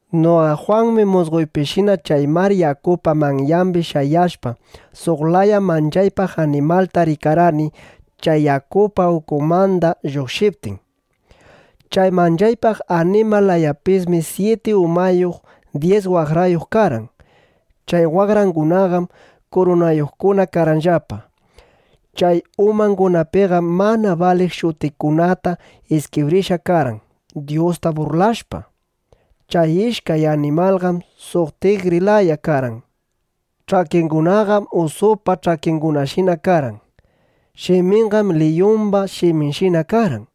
Noqa Jwanmi musqoypishina chay mar yakupa manyambi shayashpa, suq laya manchaypaq animalta rikarqani, chay yakupa ukunmanda lluqshiptin. Chay manchaypaq animal layapismi syiti umayuq dyis waqrayuq karqan. Chay waqrangunaqam kurunayuqkuna karqanllapa. Chay umangunapiqam mana baliq shutikunata iskibrishqa karqan, Dyusta burlashpa. Chay rikashqay animalqam suq tigri laya karqan. Ch'akingunaqam usupa ch'akingunashina karqan. Shiminqam liyumba shiminshina karqan.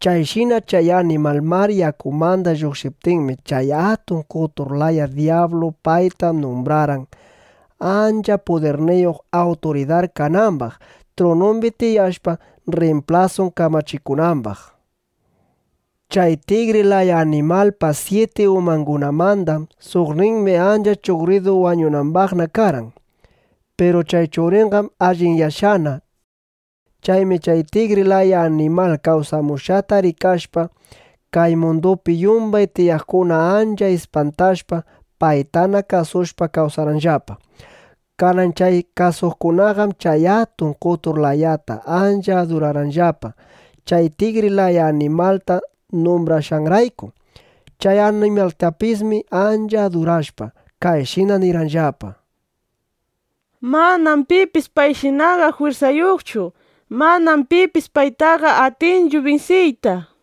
Chayshina chay animal mar yakumanda lluqshiptinmi, chay atun qotur laya dyablu payta numbrarqan, ancha pudirniyuq awturidar kanambaq, trunumbi tiyashpa, rrimplasun kamachikunambaq. Chay tigri laya animalpa syiti umangunamanda suqninmi ancha chuqridu wañunambaqna karqan. Piru chay chuqriqam allinyashqana. Chaymi chay tigri laya animal kawsamushqata rikashpa, kay mundupi yumbay tiyaqkuna ancha ispantashpa, paytana kasushpa kawsarqanllapa. Kanan chay kasuqkunaqam chay atun qotur layata ancha adurarqanllapa, chay tigri laya animalta numbrashqanrayku. Chay animaltapismi ancha adurashpa, kayshina nirqanllapa: —Manam pipis payshinaqa jwirsayuqchu. Manam pipis paytaqa atinchu binsiyta, nishpa.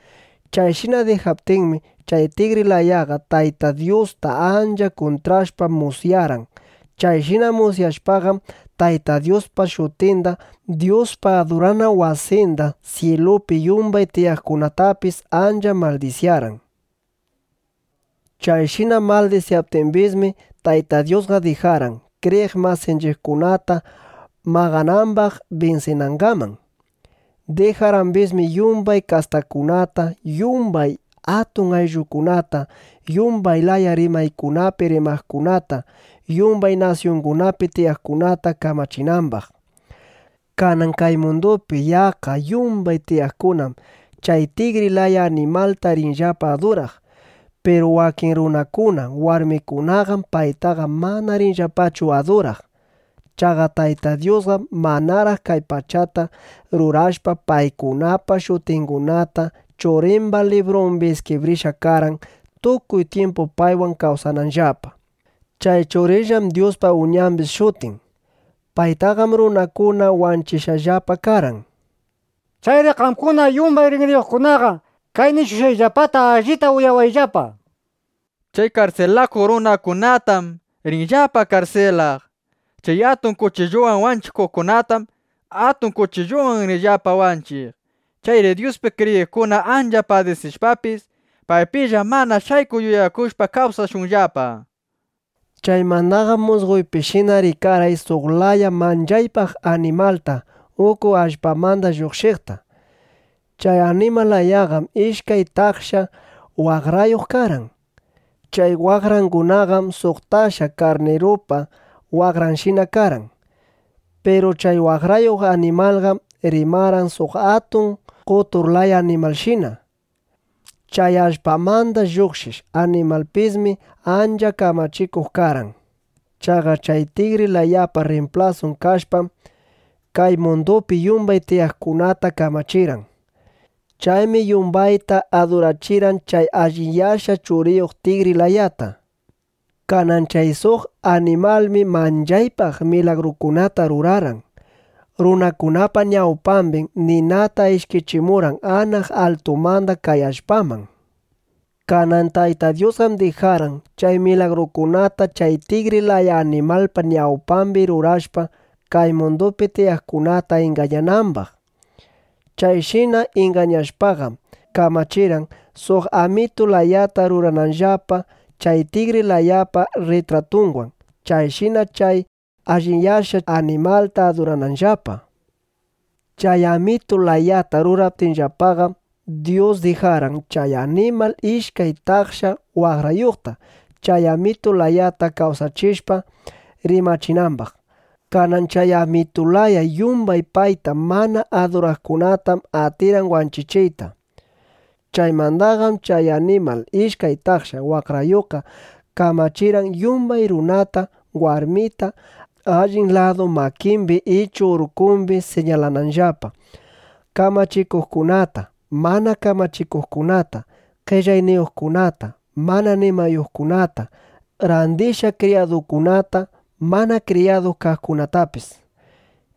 Chayshina dijaptinmi, chay tigri layaqa Tayta Dyusta ancha kuntrashpa, musyarqan. Chayshina musyashpaqam, Tayta Dyuspa shutinda, Dyuspa adurana wasinda, syilupi yumbay tiyaqkunatapis ancha maldisyarqan. Chayshina maldisyaptimbismi, Tayta Dyusqa dijarqan, kriyiq masinchiqkunata maqanambaq binsinangaman. Dijarqambismi yumbay kastakunata, yumbay atun ayllukunata, yumbay laya rimaykunapi rimaqkunata, yumbay nasyungunapi tiyaqkunata kamachinambaq. Kanan kay mundupi yaqqa yumbay tiyaqkunam chay tigri laya animalta rinllapa aduraq. Piru wakin runakuna, warmikunaqam paytaqa mana rinllapachu aduraq. Chaqa Tayta Dyusqam manaraq kay pachata rurashpa, paykunapa shutingunata Churimba librumbi iskibrishqa karqan, tukuy tyimpu paywan kawsananllapa. Chay Churinllam Dyuspa Uñambis shutin. Paytaqam runakuna wanchishqallapa karqan. Chayri qamkuna yumbay rinriyuqkunaqa kay nishushqayllapata allita uyawayllapa. Chay karsilakuq runakunatam rinllapa karsilaq. Chay atun kuchilluwan wanchikuqkunatam atun kuchilluwan rinllapa wanchiq. Chayri Dyuspi kriyiqkuna ancha padisishpapis, paypilla mana shaykuq yuyakushpa kawsashunllapa. Chaymandaqam musqoypishina rikarqay suq laya manchaypaq animalta uku allpamanda lluqshiqta. Chay animal layaqam ishkay taksha waqrayuq karqan. Chay waqrangunaqam suq taksha karnirupa waqranshina karqan. Piru chay waqrayuq animalqam rimarqan suq atun qotur laya animalshina. Chay allpamanda lluqshiq animalpismi ancha kamachikuq karqan. Chaqa chay tigri layapa rrimplasun kashpam, kay mundupi yumbay tiyaqkunata kamachirqan. Chaymi yumbayta adurachirqan chay allinyashqa chuqriyuq tigri layata. Kanan chay suq animalmi manchaypaq milagrukunata rurarqan. Runakunapa ñawpambim ninata ishkichimurqan anaq altumanda kay allpaman. Kanan Tayta Dyusqam dijarqan, chay milagrukunata chay tigri laya animalpa ñawpambi rurashpa, kay mundupi tiyaqkunata ingañanambaq. Chayshina ingañashpaqam kamachirqan, suq amitu layata rurananllapa chay tigri layapa rritratunwan, chayshina chay allinyashqa chuqriyuq animalta adurananllapa. Chay amitu layata ruraptinllapaqam, Dyus dijarqan, chay animal ishkay taksha waqrayuqta, chay amitu layata kawsachishpa, rimachinambaq. Kanan chay amitu laya yumbay payta mana aduraqkunatam atirqan wanchichiyta. Chaymandaqam chay animal ishkay taksha waqrayuqqa kamachirqan, yumbay runata warmita allin ladu makimbi ichu urkumbi siñalananllapa: kamachikuqkunata, mana kamachikuqkunata, qellayniyuqkunata, mana nimayuqkunata, randishqa kriyadukunata, mana kriyadu kaqkunatapis.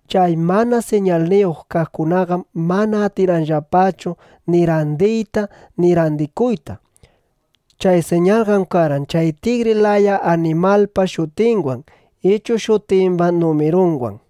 Chay mana siñalniyuq kaqkunaqam mana atirqanllapachu ni randiyta ni randikuyta. Chay siñalqam karqan chay tigri laya animalpa shutinwan ichu shutimba numirunwan.